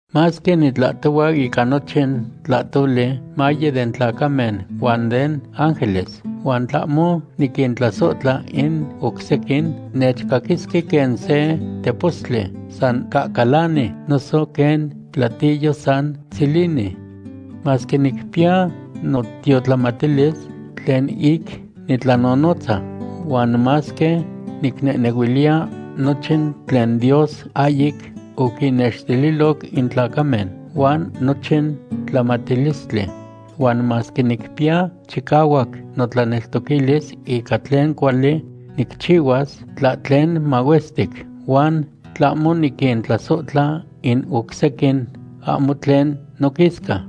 Masque nitlahtohua ica nochin tlahtoli maye den tlacamen huan den ángeles, huan tlahmo niquintlasohtla in oc sequin, nechcaquisque quen se tepostli san cacalani noso quen platillo san tzilini. Masque nicpiya notiotlamatilis tlen ic nitlanonotza, huan masque nicnehnehuiliya nochin tlen Dios ahyic oquinnextililoc in tlacamen huan nochin tlamatilistli, huan masque nicpiya chicahuac notlaneltoquilis ica tlen cuali nicchihuas tlahtlen mahuestic, huan tlahmo niquintlasohtla in oc sequin, ahmo tlen noquisca.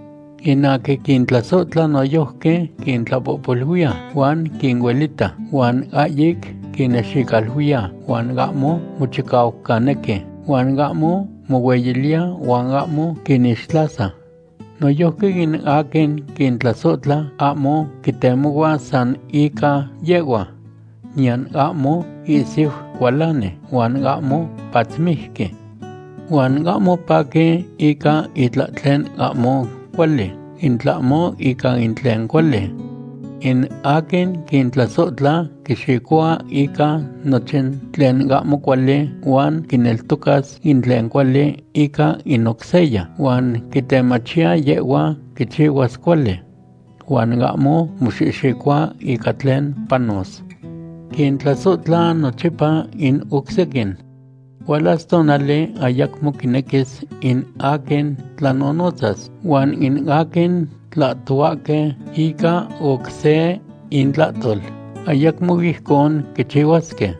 In aquin quintlasohtla noyojqui quintlapohpoluiya huan quinuelita, huan ahyic quinnexicaluiya, huan ahmo mochicaucanequi, huan ahmo mohueyiliya, huan ahmo quinixtlasa. Noyojqui in aquin quintlasohtla ahmo quitemohua san ica yehhua, niyan ahmo ihsiu cualani, huan ahmo patzmijqui. Huan ahmo paqui ica itlahtlen ahmo cuali, in tlahmo ica tlen cuali. In aquin quintlasohtla quixicohua ica nochin tlen ahmo cuali huan quineltocas in tlen cuali ica in oc seya, huan quitemachiya yehhua quichihuas cuali. Huan ahmo moxihxicohua ica tlen panos. Quintlasohtla nochipa in oc sequin. Hualas tonali ayacmo quinequis in aquin tlanonotzas, huan in aquin tlahtohuahque ica oc se intlahtol, ayacmo ijcon quichihuasque.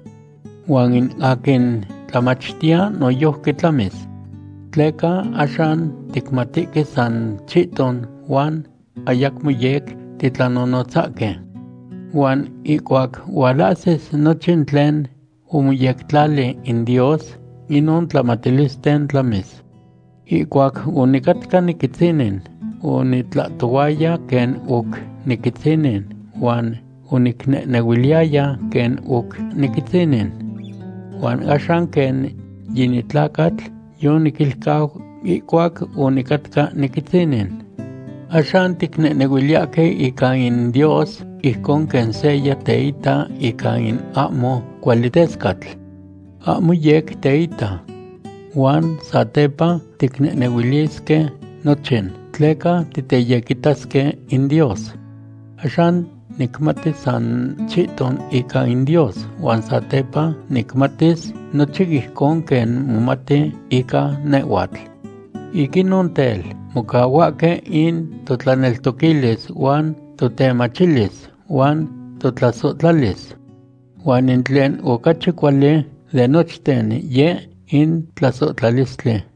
Huan in aquin tlamachtiya noyojqui tlamis. Tleca axan ticmatihque san chihton huan ayamo yec titlanonotzahque. Huan ihcuac hualahsis nochin tlen omoyectlali in Dios, inon tlamatilisten tlamis. Ihcuac onicatca niquitzinin, onitlahtohuaya quen oc niquitzinin huan onicnehnehuiliyaya quen oc niquitzinin. Huan axan quen yinitlacatl yoniquilcau ihcuac onicatca niquitzinin. Axan ticnehnehuiliyahque ica in Dios ijcon quen seya teita ica in ahmo cuali tescatl. Ahmo yec teita. Huan satepa ticnehnehuilisque nochin, tleca titeyequitasque in Dios. Axan nicmati san chihton ica in Dios huan satepa nicmatis nochin ijcon quen momati ica nehhuatl. Ic inon tel, mocahuahque in totlaneltoquilis huan totemachilis huan totlasohtlalis. Huan in tlen ocachi cuali de nochten yeh in tlasohtlalistli.